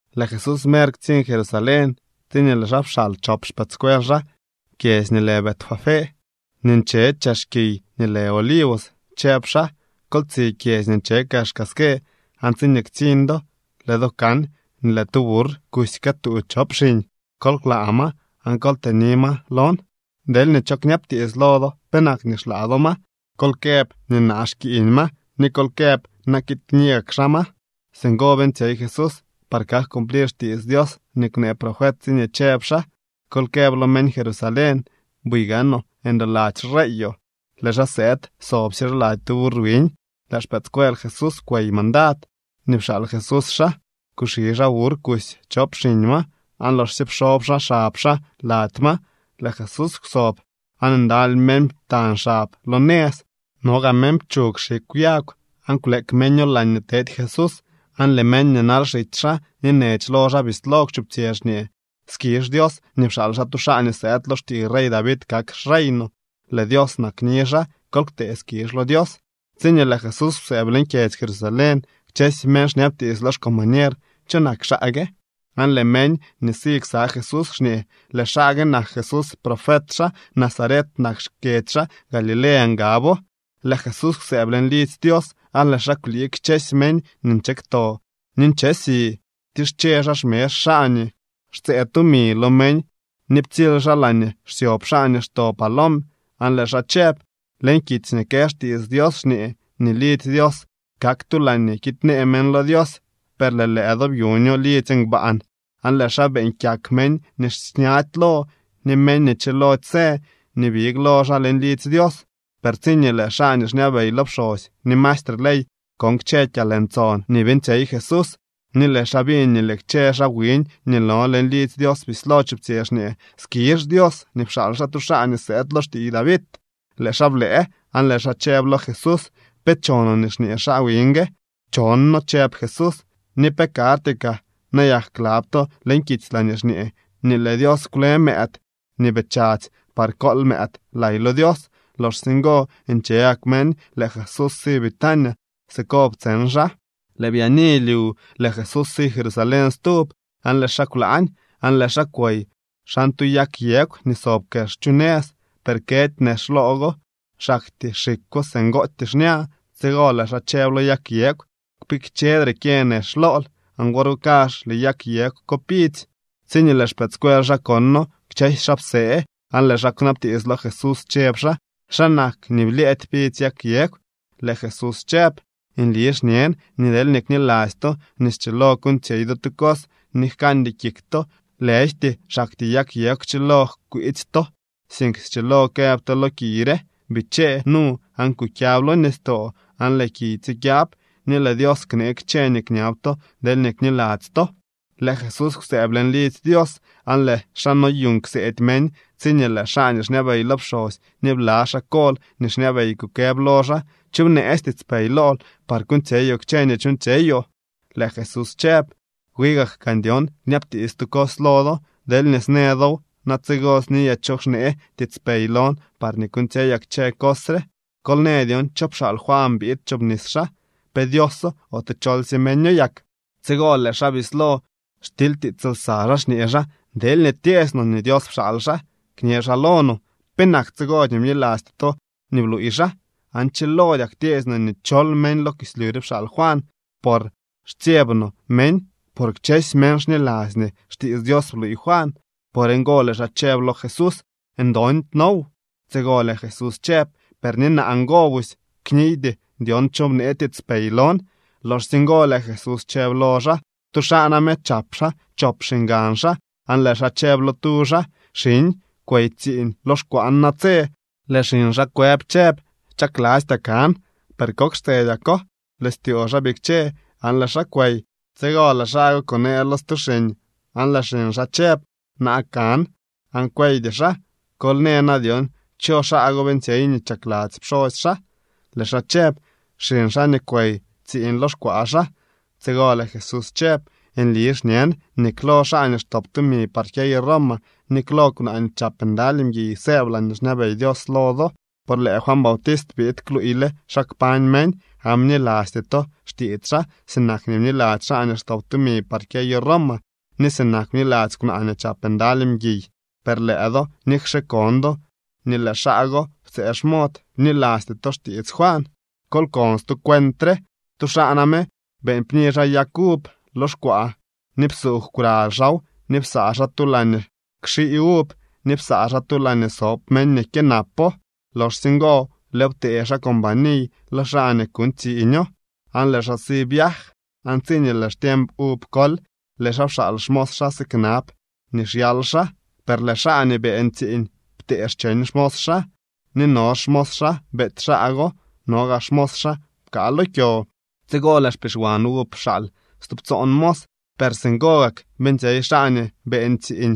Lëë Jesús mer ktsiñ Jerusalén tsiñee lëë xaa pxaal chop xpëëdscuel xaa kyedzy nii lë Betfagé nii nche chex kiy nii lë Olivos. Chëb xaa: —Kol tsi kyedzy nii nche kexka ske aan tsiñee ktsiñ do, lëë do kan nii lëë tu burr kusy këtuu chop xiñ. Kol klaa ma aan kol tëni ma lon. Deelñee cho kñabtiits lo do penak nii xlaa do ma, kol këb nii naa xkiiñ ma ni kol këb na kiid kni gak xaa ma. Singo beeñtsyey Jesús par kak cumplir xtiits Dios nii kwnee profet tsiñee chëb xaa: Kol këb lo meñ Jerusalén: “Buy gaanoo ndoladzy xreeyoo, lëë xaa sëëd soobsye xaa lady tu burr wiñ.” Lëë xpëëdscuel Jesús kwey mandad nii pxaal Jesús xaa. Kuxi xaa burr kusy chop xiñ ma aan loxsye pxoob xaa xab xaa lady ma, lëë Jesús kwsob. Aan ndaly meñ ptañ xab lo nëz. No gaa meñ pchug xikw yag aan kwleek meño laañee tedy Jesús. Aan lëë meñ nii nal xitsy xaa ni nech lo xaa bislo kwchuptsyë xñee: —¡Skizh Dios nii pxaal xaa tu xaa nii sëëd lo xtiiy rey David kak xrey no! ¡Lëë Dios nakni xaa! ¡Kol ktee skizh lo Dios! Tsiñee lëë Jesús kwsëëb leñ kyedzy Jerusalén, kchësy meñ xñabtiits lo xcombañer: —¿Cho nak xaa gue? Aan lëë meñ nii si ksa Jesús xñee: —Lëë xaa gue nak Jesús. Profet xaa, Nazaret nak xkyedzy xaa. Galilea ngabo. Lëë Jesús kwsëëb leñ lidzy Dios, aan lëë xaa kwlii kchësy meñ nii nche kto ni nche si. Ptische xaa xmezh xaa nii xtsëë tumi lo meñ ni ptsily xaa laañee xsyob xaa nii xto palom. Aan lëë xaa chëb: —Leñ kitsy nii kë xtiits Dios xñee nii lidzy Dios kak tu laañee kiidnee meñ lo Dios. Per lëë do byuño lidzy ngbaan. Aan lëë xaa beeñ kyak meñ nii xñady lo ni meñ nii chilody së nii big lo xaa leñ lidzy Dios. Per tsiñee lëë xaa nii xñabey lo pxosy ni maestre ley kon kchë kyalntson nii beeñtsyey Jesús, ni lëë xaa biñ nii lëë kchë xaa wiñ nii no leñ lidzy Dios bislo chuptsyë xñee: “¡Skizh Dios nii pxaal xaa tu xaa nii sëëd lo xtiiy David!”, lëë xaa blëë aan lëë xaa chëb lo Jesús: —¿Pe chonoo nii xñee xaa wiñ gue? —Chonno —chëb Jesús— ¿ni pe karty kaa nayak klab to leñ kitsy laañee xñee nii lëë Dios kwle mëëd nii bii chadzy par kool mëëd lay lo Dios? Loxsye ngo nche gak meñ, lëë Jesús si Betania. Siko ptseñ xaa. Lëë byaani lyu lëë Jesús si Jerusalén stub, aan lëë xaa kwlaañ. Aan lëë xaa kwey xan tu yag yegw nii sob kex chu nëz, per këdy nex loo go. Xaktyee xikwo singootyee xña. Tsigo lëë xaa chëb lo yag yegw: —¡Kpikchedre kyë nex lool! Aan wor go kazh lëë yag yegw ko pidzy. Tsiñee lëë xpëëdscuel xaa kono, kchësy xaa psee, aan lëë xaa kwnabtiits lo Jesús chëb xaa: —¿Xa nak nii blyëëdy pidzy yag yegw? Lëë Jesús chëb: —Nli xñen nii deelñee kniladzy to nii schilo kuuñtsyey do tu cos ni jkandy kik to, lëjty xaktyee yag yegw kchilo jkwiitsy to, sink schilo këb to lo kiy re: “Bichee nu aan kukyab lo nistoo”, aan lëë kiy tsikyab. Ni lëë Dios knee kchë nii kñab to deelñee kniladzy to. Lëë Jesús kwsëëb leñ lidzy Dios aan lëë xaa noyuuñ kseedy meñ tsiñee lëë xaa nii xñabey lo pxosy ni bla xaa kol nii xñabey kukëb lo xaa: —¿Cho bneetsy tiitspey lool par kuuñtsyeyoo kchë nii chuuñtsyeyoo? Lëë Jesús chëb: —Wi gak gaan dyon kñabtiits tu cos lo do. Deelñee snë dow na tsigo sniyaa cho xnee tiitspey lon par kuuñtsyeyaa kchë cos re. Kol në dyon cho pxaal Juan biid kchobnis xaa. ¿Pe Dioso ote cholsye meño yak? Tsigo lëë xaa bislo xtilytiits lsa xaa, xñee xaa: —Deelñee tyeesy no nii Dios pxaal xaa, kñë xaa lo no: “¿Penak tsigo nii bnilasty to nii bluuy xaa?” Aan chilodyak tyeesy no nii chol meñ lo kislyu re pxaal Juan, por xtsyeb no meñ. Por kchësy meñ xniladzy nii xtiits Dios bluuy Juan. Por ngo lëë xaa chëb lo Jesús: —Ndondy noow. Tsigo lëë Jesús chëb: —Per ni naa ngo busy kniydy dyon cho bnee tiitspey lon. Loxsye ngo lëë Jesús chëb lo xaa: —Tu xaa name chap xaa chop xiñgan xaa aan lëë xaa chëb lo tu xaa: “Xiñ, kwey tsiiñ lo xkwaan natse.” Lëë xiñ xaa kwëb chëb: “¡Chaklastyaa kan!” Per kok xtsedyako lëë styoo xaa bikche aan lëë xaa kwey. Tsigo lëë xaa go kunee lo stu xiñ aan lëë xiñ xaa chëb: “Na kan.” Aan kweydy xaa. Kol në na dyon cho xaa go beeñtsyey nii chakladzy pxosy xaa. Lëë xaa chëb: —Xiñ xaa nii kwey tsiiñ lo xkwaa xaa. Tsigo lëë Jesús chëb: —Nli xñen nii klo xaa nii xtop tumi par kyeyo Roma ni klo kwnaa nii chap ndaly mguiy sëëb laañee xñabey Dios lo do. Por lëë Juan Bautist biid kluuyle xa kpañ meñ, aan bnilasty to xtiits xaa sinak nii bniladzy xaa nii xtop tumi par kyeyo Roma ni sinak bniladzy kwnaa nii chap ndaly mguiy. Per lëë do, nikxe kon do nii lëë xaa go ptsëë xmod, bnilasty to xtiits Juan. ’Kol kon stu cuent re. Tu xaa name beeñ pni xaa yag uv lo xkwaa ni psuugw kwraly xaaw ni psaa xaa tu laañee kxii uv ni psaa xaa tu laañee sob meñ nii kyënapo. ’Loxsye ngo lëëw ptee xaa companiy lo xaa nii kuuñ tsiiño, aan lëë xaa si viaj. Aan tsiñee lëë xtiemp uv kol, lëë xaa pxaal xmos xaa siknab nii xyal xaa. Per lëë xaa nii beeñ tsiiñ ptee cheñ xmos xaa, ni no xmos xaa beety xaa go, no gaa xmos xaa pkaa lo kyo. Tsigo lëë xpixwan uv pxaal stubtsoon mos. Per singo gak beeñtsyey xaa nii beeñ tsiiñ.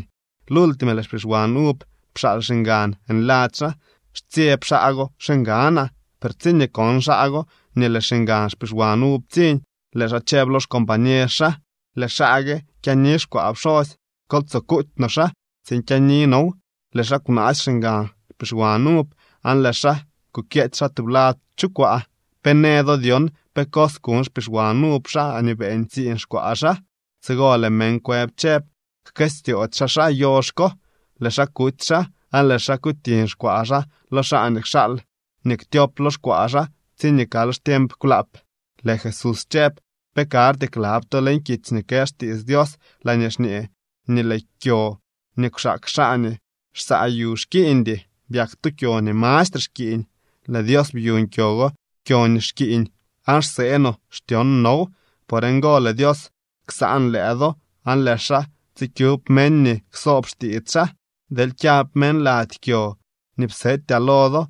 ’Lultime lëë xpixwan uv pxaal xiñgan nladzy xaa: “Stsyeb xaa go xiñganaa.” Per tsiñee kon xaa go nii lëë xiñgan xpixwan uv ptsiñ, lëë xaa chëb lo xcombañer xaa: “Lëë xaa gue kyaani xkwaa pxosy. Kol tsoo kuuty no xaa tsiin kyaani now.” Lëë xaa kwnaasy xiñgan xpixwan uv aan lëë xaa kukyeety xaa tublad chu kwaa. ’¿Pe në do dyon pe cos kuñ xpixwan uv xaa nii beeñ tsiiñ xkwaa xaa? Tsigo lëë meñ kwëb chëb: —Jkëstyoody xaa xaa yox ko, lëë xaa kuty xaa, aan lëë xaa kutiñ xkwaa xaa lo xaa nii kxaal nii ktyop lo xkwaa xaa tsiñee kal xtiemp kwlaap. Lëë Jesús chëb: —¿Pe karty klab to leñ kitsy nii kë xtiits Dios laañee xñee nii lëë kyo nii kwxaak xaa nii xsaa yu xkiiñdy? Byak tu kyo nii mastre xkiiñ. Lëë Dios byuñ kyo go kyo nii xkiiñ, aan xsee no xtyon now. Por ngo lëë Dios ksaan lëë do aan lëë xaa tsikyub meñ nii ksoob xtiits xaa. Deel kyab meñ lady kyo nii psetyaa lo do,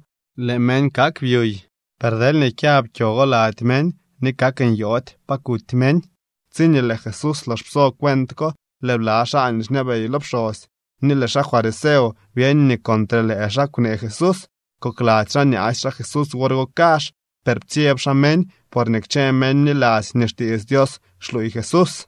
lëë meñ kak byuy. Per deelñee kyab kyo go lady meñ, ni kak nyoody pa kuty meñ. Tsiñee lëë Jesús lox pso cuent ko, lëë bla xaa nii xñabey lo pxosy ni lëë xaa fariseo byeñ nii contre lëë xaa kwnee Jesús. Kokladzy xaa nyaasy xaa Jesús wor go kazh, per ptsyeb xaa meñ, porñee kchë meñ bniladzy nii xtiits Dios xluuy Jesús.